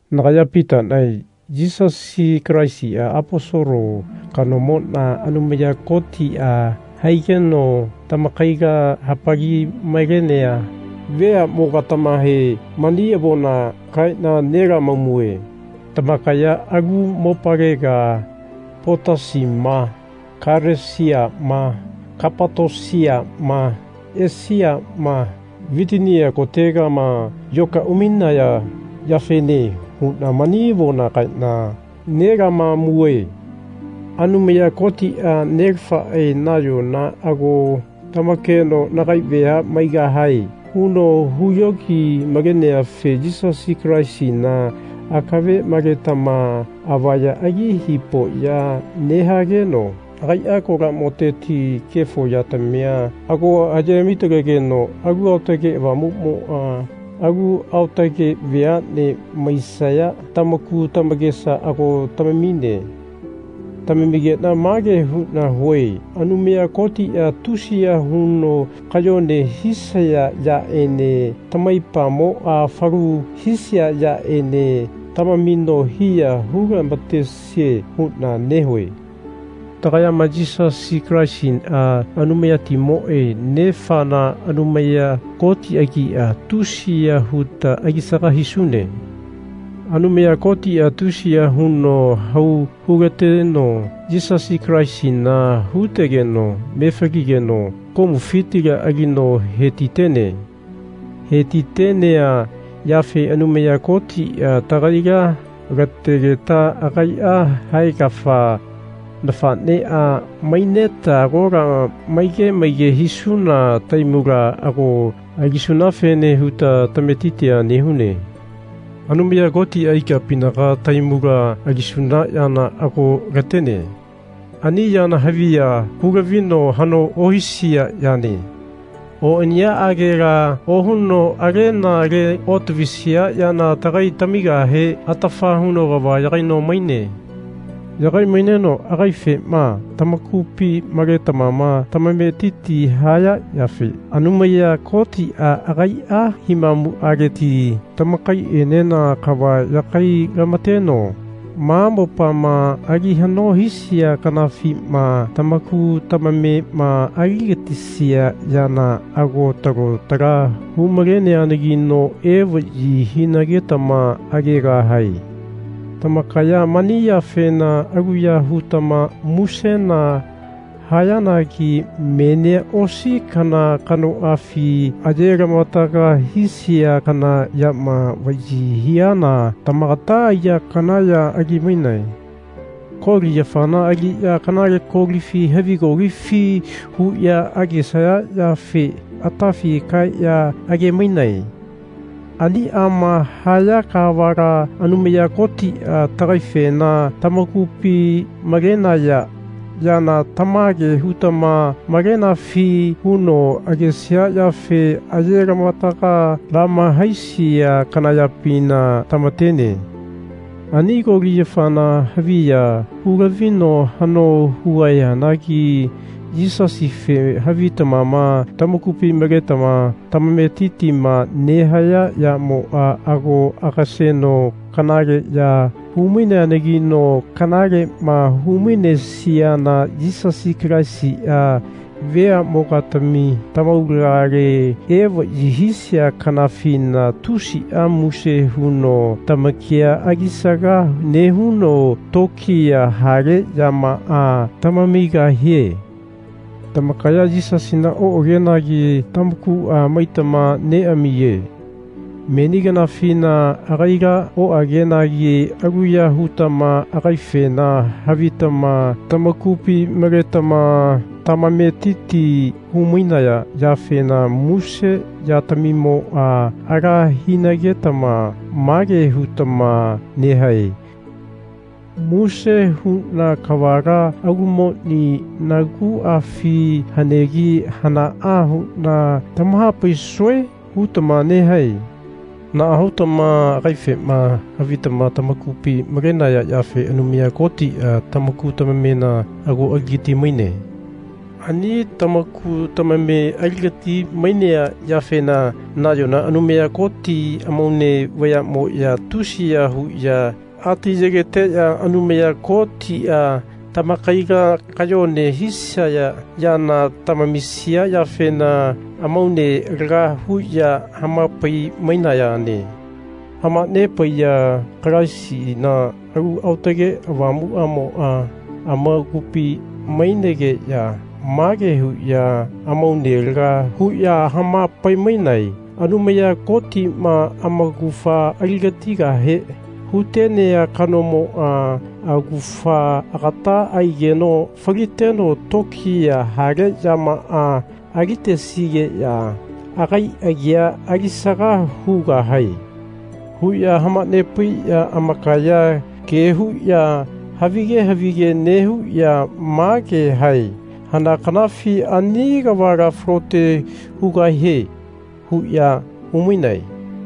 Nagaya Pitanae Yisasi Kalaisi Aposolo kanomona Anumaya Kotia haigeno tamakaila hapali-malenea veamogatamahe mani avona kaena nelamamue. Tamakaya alu mopalega Potasima Kalesiama Kapatosiama Esiama Vitinia kotegama yoka umainaya yafene huna mani avona kaena nelamamue. Anumaya Kotia Nelafae nayona ago tamakeno Nagai vea maigahae. huno huyogi-maleneafe Yisasi Kalaisina akave maletama avaya ali hipoya nehageno agaia kolamoteti kefo yatamia ago aye hami-talegeno Alu Aotage Avamumoa alu aotage veane maisaya tamaku tamakesa ago tamamine. Tamamigena mage huna hue Anumaya Kotia tusiya huno kayone hisaya yaene tamaipamoa falu hisia yaene tamamino hiya hu-lamatesie. huna nehue. Tagayama Yisasi Kalaisia Anumayatimoe Nefana Anumaya Koti agia, tusiya huta alisaga hisune. Anumaya Kotia tusiya huno hau hulateno Yisasi Kalaisina hutegeno mefaligeno komufitila alino hetitene. Hetitenea yafe Anumaya Kotia tagaila lategeta agaia haegafa nafanea maineta agola maige maige hisuna tahaimula ago alisunafene huta tametitia nehune Anumaya Kotia ikapinaga tahaimula alisuna yana ago latene. Ani yana haviya hulavino hano ohisia yane. Oniyaagela ohuno alena le otavisia yana tagai tamigahe atafa huno kava yagaino maine. Yagai-maineno agaifema tamakupi maletama tamametiti haya yafe Anumaya Kotia agaia himamuleti tamakaienena kava yagai-lamateno ma mopama ali hano hisia kanafima tamaku tamamema aligatisia yana ago talo tala hu-maleneanagino evayi hinagetama agegahae. Tamakaya mani yafena aluya hutama musena hayanagi menia osi kana kanoafi aye-lamavataga hisia kana yama vayi hiana tamagata aiya kana ya ali-mainae. Koli yafana aliya Kanale Kolifi havi Kolifi? huya agesaya yafe atafi kaeya age-mainae. Aniama haya kavala Anumaya Kotia Nagaifena tamakupi malenaya yana tamage hutama malenafi? huno agesia yafe aye lamavataga lama-haisia kana yapina tamatene. Ani Koli yafana haviya hu-lavino hano hugahianagi Yisasife havitama tamakupi maletama tamametitima nehaya yamoa ago agaseno kanale ya hu-maineanagino kanalema hu-mainesiana Yisasi Kalaisia veamogatami tamaulagale evayi hisia kanafina tusia muse huno tamakia alisaga nehuno tokiya hale yamaa tamamigahie. Tamakaya Yisasina oagenagi tamakua maitama neamiye. Meni kanafina agaila oagenagi aluya hutama agaifena havitama tamakupi maletama tamametiti hu-mainaya yafena muse yatamimoa ala hinagetama mage hutama nehae Muse huna kavala alumoni naguafi hanegi hanaa huna tamahapaisue? hutama nehae. Naa hutama agaifema havitama tamakupi malenaya yafe Anumaya Kotia tamaku tamamena ago aligati-maine. Ani tamaku tamame aligati-mainea yafena nayona Anumaya Koti amaune vayamoya tusiya huya ati yegeteya Anumaya Kotia tamakaila kayone hisaya yana tamamisia yafena amaune laga huya hamapai-mainayane. Hamanepaiya Kalaisina Alu Aotage Avamuamoa amakupi mainegeya mage huya amaunea laga huya hamapainae Anumaya Kotima amaugafa aligatigahe hutenea kanomoa augafa agata aigeno faliteno tokiya hale yamaa alitesigeya agai agia alisaga hugahae. huya hamanepaiya amakaya kea huya havige havige nehuya mage hae Hana kanafi ani kavala falote hugahie? huya humainae.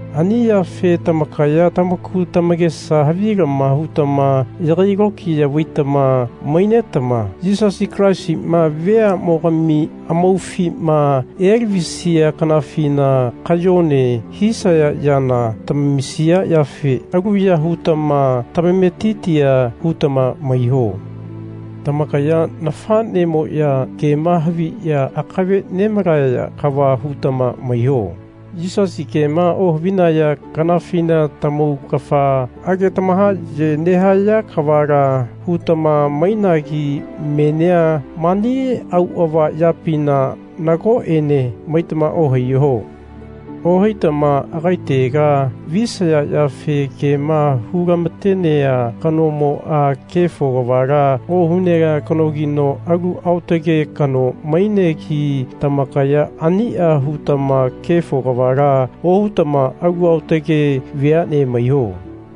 Ani yafe tamakaya tamaku tamakesa havilama hutama yagai lokiya vaitama mainetama Yisasi Kalaisima veamogami amaufima elavisia kanafina kayone hisaya yana tamamisia yafe aluya hutama tamametitia hutama maiho. Tamakaya nafanemoya kema haviya akave nemalaya kava hutama maiho. Yisasi kema ohavinaya kanafina tamaugafa age tamahaye nehaya kavala hutama mainagi menia mani auava yapina nagoene maitama ohaiho. Ohaitama agaitega visaya yafe kema hu-lamatenea kanomoa kefo kavala ohunea kanogino alu aotage kano mainegi tamakaya ania hutama kefo kavala ohutama alu aotage veane maiho.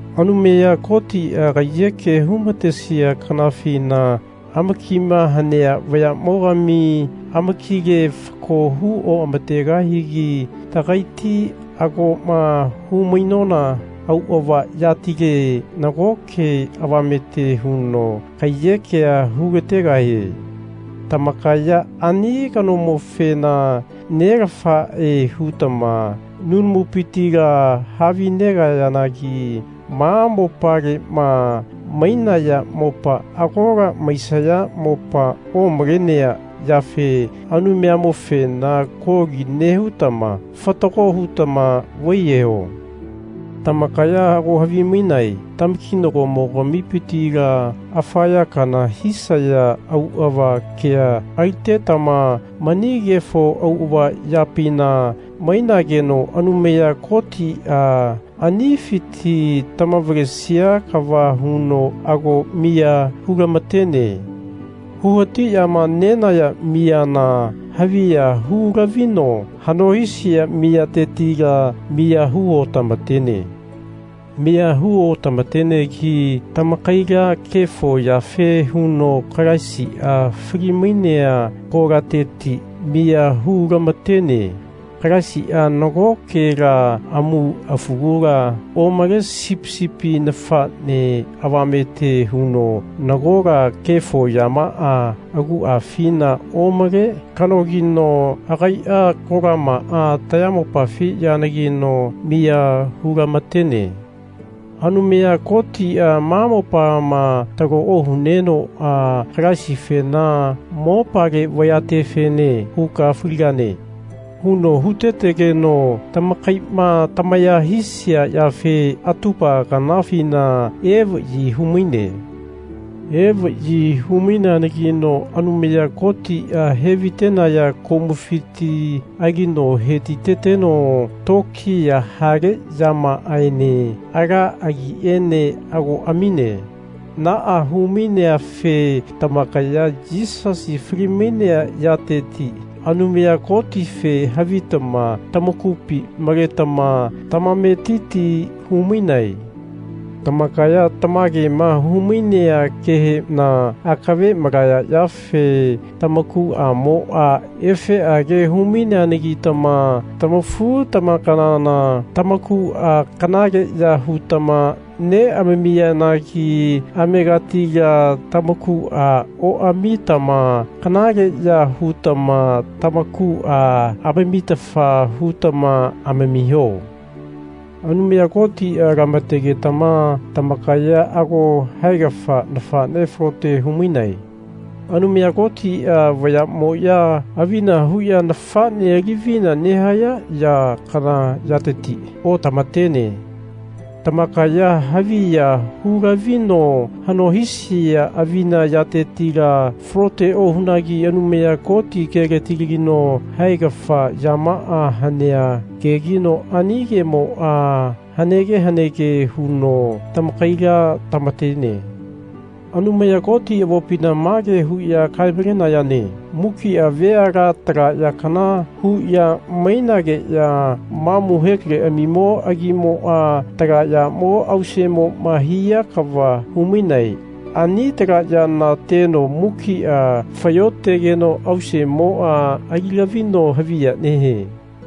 Anumaya Kotia kaiyeke humatesia kanafina amakima hanea vayamogami amakile fako hu oamategahigi tagaiti agoma hu-mainona auava yatileti nagoke avamete huno kaiyekea hu-lategahie. Tamakaya ani kanomofena Nelafae hutama nunamupitila havinegayanagi ma mopalema mainaya mopa agola maisaya mopa omalenea yafe Anumayamofena kolia nehutama fatago hutama vaiyeho. Tamakaya ago havimainae tamakinagomo-gamipitila afa ya kana hisaya auava kea alitetama mani kefo auava yapina mainageno Anumaya Kotia anifiti tamavalesia kava huno ago miya hu-lamatene. Hu hatiyama nenaya miyana haviya hu-lavino hano hisia miyatetila miya hu otamatene. Miya hu otamatenegi tamakaila kefo yafe huno Kalaisia fali-mainea kolateti miya hu-lamatene. Kalaisia nagokela amu afugula omale Sipi sipi nafane avamete huno nagola kefo yamaa aguafina omale kanogino agaia kolamaa tayamopafi yanagino miya hu-lamatene. Anumaya Kotia ma mopama talo ohunenoa Kalaisifena Mopale vayatefene huka faligane. huno hutetegeno tamakaima tamaya hisia yafe atupa kanafina evayi humaine. Evayi hu-maineanagino Anumaya Kotia hevaitenaya komufiti alino hetiteteno tokiya hale yamaaene ala agiene ago amine. Naa hu-maineafe tamakaya Yisasi fali-mainea yateti Anumaya Kotife havitama tamakupi maletama tamametiti humainae. Tamakaya tamagema hu-mainea kehena akave malaya yafe tamakuamoa efeage hu-maineanagitama tamafu-tamakanana tamakua kanaleya hutama neamamiyanagi amegatila tamakua oamamitama kanaleya hutama tamakua amamitafa hutama amamiho. Anumaya Kotia lamategetama tamakaya ago haegafa nafane falote humainae. Anumaya Kotia vayamoya avina huya nafane alivina nehaya ya kana yateti otamatene. Tamakaya haviya hu-lavino hano hisia avina yatetila falote ohunagi Anumaya Koti keletilagino haegafa yamaa hanea kegino ani kemoa hanege hanege huno tamakaila tamatene. Anumaya Koti avopina mage huya kae-malenayane Mukia veala tala ya kana huya mainageya mamu hekaleamimo agimoa tala yamo ausemoma hia kava humainae. Ani tala yana teno mukia fayotegeno ausemoa ali lavino haviya nehie.